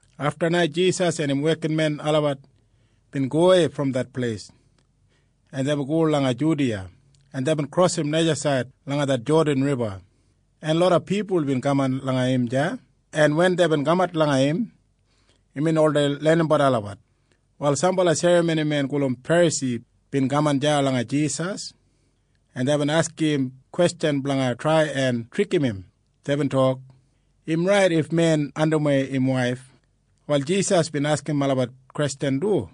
Afta na Jisas en im wekinmen olabat bin gowei brom det pleis, en deibin go langa Judiya, en deibin krosim najasaid langa det Jodan Riba, en loda pipul bin kaman langa im deya, en wen deibin kamat langa im, imbin oldei lenimbat olabat. Wal sambala serramonimen gulum Ferasi bin kaman deya langa Jisas, en deibin askim im kwestjan blanga trai en trikim im. Deibin tok, “Im rait if men andimwei im waif?” Wal Jisas bin askim olabat kwestjan du,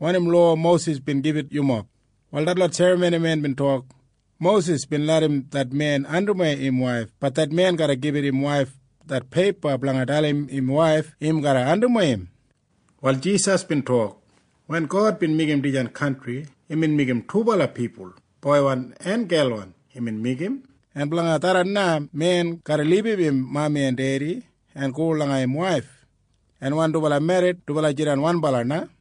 “Wanim lowa Mosis bin gibit yumob?” Wal detlot serramonimen bin tok, “Mosis bin larram det men andimwei im waif. Bat det men garra gibit im waif det peipa blanga dalim im waif im garra andimwei im.” Wal Jisas bin tok, “Wen God bin meigim dijan kantri, imbin meigim dubala pipul, boiwan en gelwan imbin meigim. En blanga tharran na men garra libum im mami en dedi en go langa im waif, en wen dubala merrit, dubala jidan wanbala na,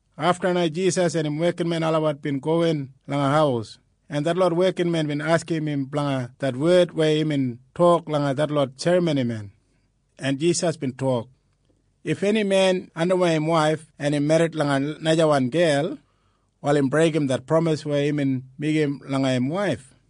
Afta na Jisas en im wekinmen olabat bin gowin langa haus, en detlot wekinmen bin askim im blanga det wed weya imbin tok langa detlot serramonimen, en Jisas bin tok, “If eni men andimwei im waif, en im merrit langa najawan gel, wal im breigim det pramis weya imbin meigim langa im waif.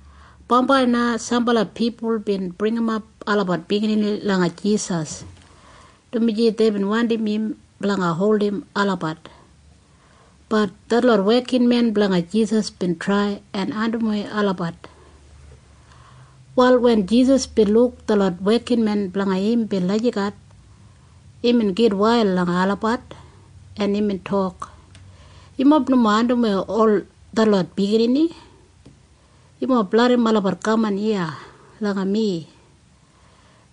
Bambai na sambala pipul bin bringimap olabat biginini langa Jisas, dumaji deibin wandim im blanga holdim olabat. Bat detlot wekinmen blanga Jisas bin trai en andimwei olabat. Wal wen Jisas bin luk detlot wekinmen blanga im bin lagijat, imbin gitwail langa olabat, en imbin tok, “Yumob nomo andimwei ol detlot biginini. Yumob larram olabat kaman iya langa mi,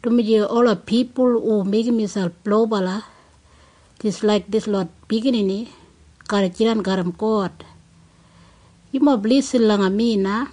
dumaji ola pipul hu meigim miselp lobala jis laik dislot biginini garra jidan garram God. Yumob lisin langa mi na.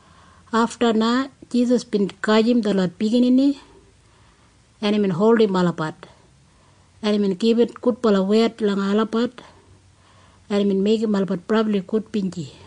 Afta na Jisas bin gajim detlot biginini, en imbin holdim olabat, en imbin gibit gudbala wed langa olabat, en imbin meigim olabat brabli gudbinji.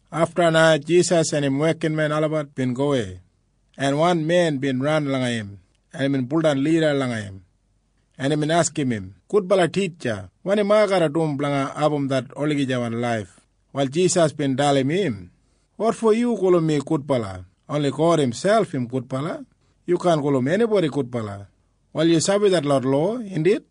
Afta na Jisas en im wekinmen olabat bin gowei, en wan men bin ran langa im, en imbin baudan lida langa im, en imbin askim im, “Gudbala Titja, wanim ai garra dum blanga abum det olagijawan laif?” Wal Jisas bin dalim im, “Wotfo yu gulum mi gudbala? Oni God imselp im gudbala. Yu kaan gulum enibodi gudbala. Wal yu sabi detlot lowa, indit?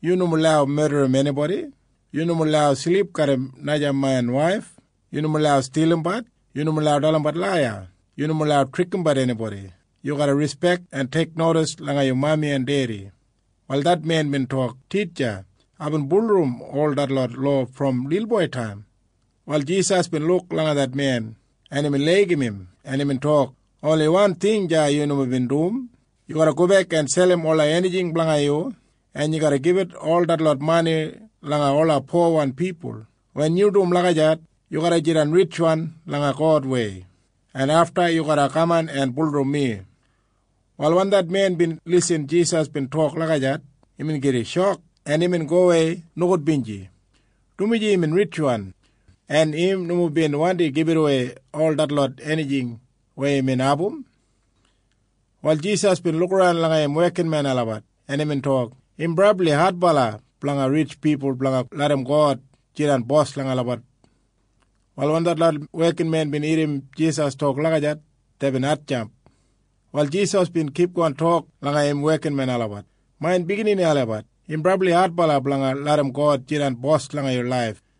Yu nomo lau medrim enibodi. Yu nomo lau silip garram naja men waif. Yu nomo lau stilimbat. Yu nomo lau dalimbat laiya. Yu nomo lau trikimbat enibodi. Yu garra rispek en teiknodis langa yu mami en dedi.” Wal det men bin tok, “Titja, aibin bulurrum ol detlot lowa brom lilboitaim.” Wal Jisas bin luk langa det men, en imbin laigim im, en imbin tok, “Oni wan ting deya yu nomo bin dum. Yu garra gobek en selim ola enijing blanga yu, en yu garra gibit ol detlot mani langa ola powan pipul. Wen yu dum lagijat, yu garra jidan ritjwan langa Godwei, en afta yu garra kaman en bulurrum mi.” Wal wen det men bin lisin Jisas bin tok lagijat, imbin gida shok, en imbin gowei nogudbinji, dumaji imbin ritjwan, en im nomo bin wandi gibitawei ol detlot enijing weya imbin abum. Wal Jisas bin lukaran langa im wekinmen olabat, en imbin tok, “Im brabli adbala blanga ritj pipul blanga larram God jidan Bos langa olabat.” Wal wen detlot wekinmen bin irrim Jisas tok lagijat, deibin hatjamp. Wal Jisas bin kipgon tok langa im wekinmen olabat, “Main biginini olabat, im brabli adbala blanga larram God jidan Bos blanga yu laif.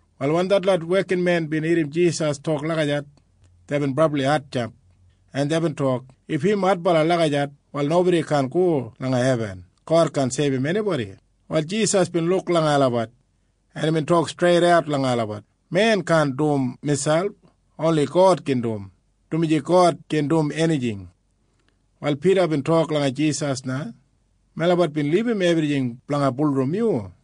Wal wen detlot wekinmen bin irrim Jisas tok lagijat, deibin brabli hatjamp, en deibin tok, “If im adbala lagijat, wal nobodi kaan go langa hebin! God kaan seibum enibodi!” Wal Jisas bin luk langa olabat, en imbin tok streidat langa olabat, “Men kaan dum miselp. Oni God gin dum, dumaji God gin dum enijing.” Wal Pida bin tok langa Jisas na, “Melabat bin libum ebrijing blanga bulurrum yu.”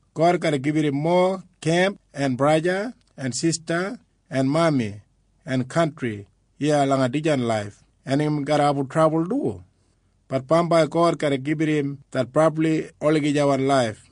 God garra gibit im mowa kemp en braja en sista en mami en kantri iya langa dijan laif. En im garra abum trabul du. Bat bambai God garra gibit im det brabli olagijawan laif.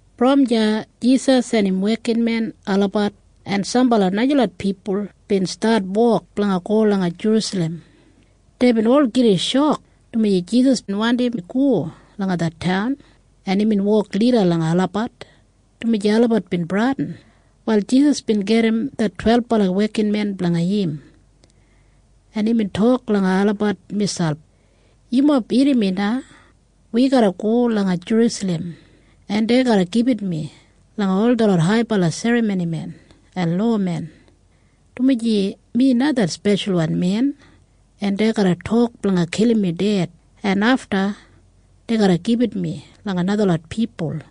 Brom deya Jisas en im wekinmen olabat en sambala najalot pipul bin stat wok blanga go langa Jerusalem. Deibin ol gida shok, dumaji Jisas bin wandi go langa det taun, en imbin wok lida langa olabat, dumaji olabat bin bradin. Wal Jisas bin gedim det twelbala wekinmen blanga im, en imbin tok langa olabat miselp, “Yumob irrim mi na. Wi garra go langa Jerusalem, en dei garra gibit mi langa ol detlot haibala serramonimen en lowamen, dumaji mi na det Speshalwan Men. En dei garra tok blanga kilim mi ded. En afta dei garra gibit mi langa najalot pipul,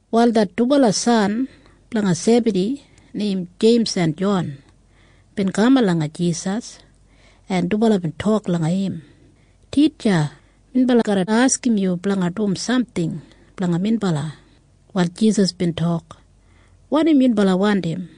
Wal det dubala san blanga Sebadi neim Jeims en Jon bin kaman langa Jisas, en dubala bin tok langa im, “Titja, minbala garra askim yu blanga dum samting blanga minbala.” Wal Jisas bin tok, “Wanim yunbala wandim?”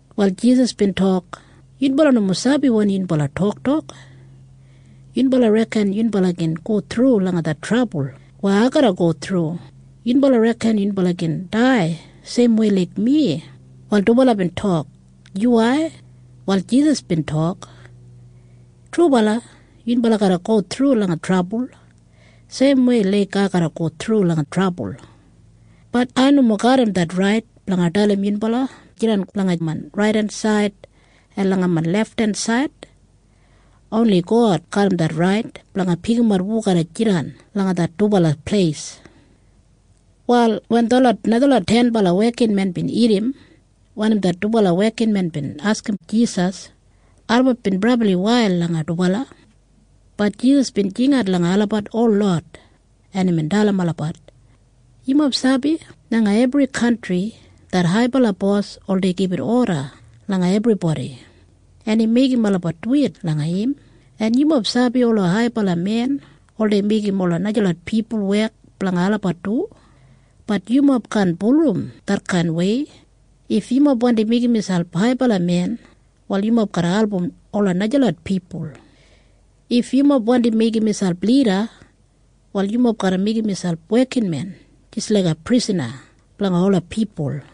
Wal Jisas bin tok, “Yunbala nomo sabi wanim yunbala toktok. Yunbala reken yunbala gin go thru langa det trabul weya ai garra go thru? Yunbala reken yunbala gin dai seimwei laik mi?” Wal dubala bin tok, “Yuwai.” Wal Jisas bin tok, “Trubala yunbala garra go thru langa trabul seimwei laik ai garra go thru langa trabul. Bat ai nomo garram det rait blanga dalim yunbala blanga jidan langa main raidensaid en lefthensaid. Oni God garram det rait blanga pikimat hu garra jidan langa det dubala pleis.” Wal wen detlot najalot tenbala wekinmen bin irrim wanim det dubala wekinmen bin askim Jisas, olabat bin brabli wail langa dubala. Bat Jisas bin jingat langa olabat holot, en imbin dalim olabat, “Yumob sabi langa ebri kantri det haibala bos oldei gibit oda langa ebribodi, en im meigim olabat duwit langa im. En yumob sabi ola haibala men oldei meigim ola najalot pipul wek blanga olabat du. Bat yumob kaan bulurrum detkainwei. If yumob wandi meigim miselp haibala men, wal yumob garra album ola najalot pipul. If yumob wandi meigim miselp lida, wal yumob garra meigim miselp wekinmen jis laiga prisana blanga ola pipul.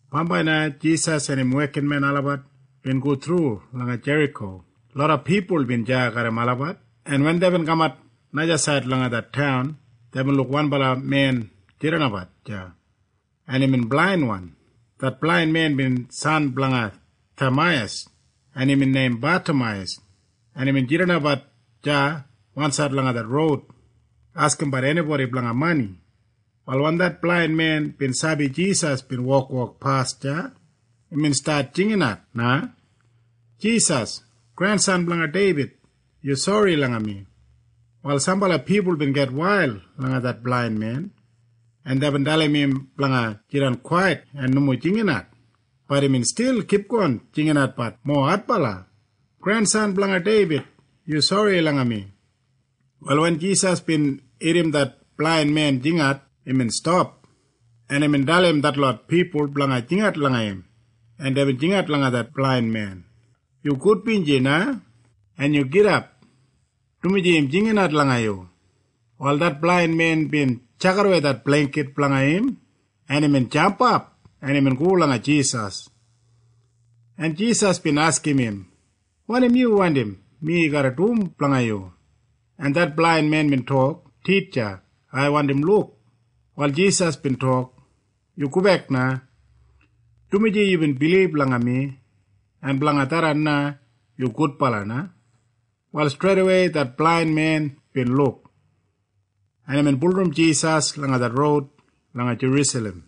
Bambai na Jisas en im wekinmen olabat bin go thru langa Jeriko. Loda pipul bin deya garram olabat, en wen deibin kamat najasaid langa det taun, deibin luk wanbala men bin jidanbat deya, en imbin blainwan. Det blain men bin san blanga Tameiyas, en imbin neim Batameiyas, en imbin jidanbat deya wansaid langa det roud askimbat enibodi blanga mani. Wal wen det blain men bin sabi Jisas bin wokwok pas deya, imbin stat jinginat na, “Jisas! Grensan blanga Deibid! Yu sori langa mi!” Wal sambala pipul bin gitwail langa det blain men, en deibin dalim im blanga jidan kwait en nomo jingat. Bat imbin stil kipgon jinginatbat mowa adbala, “Grensan blanga Deibid! Yu sori langa mi!” Wal wen Jisas bin irrim det blain men jingat, imbin stap, en imbin dalim detlot pipul blanga jingat langa im, en deibin jingat langa det blain men, “Yu gudbinji na, en yu gidap, dumaji im jinginat langa yu.” Wal det blain men bin tjakidawei det bleingkit blanga im, en imbin jampap, en imbin go langa Jisas, en Jisas bin askim im, “Wanim yu wandim mi garra dum blanga yu?” En det blain men bin tok, “Titja, ai wandi luk.” Wal Jisas bin tok, “Yu gobek na, dumaji yubin bilib langa mi, en blanga tharran na yu gudbala na.” Wal streidawei det blain men bin luk, en imbin bulurrum Jisas langa det roud langa Jerusalem.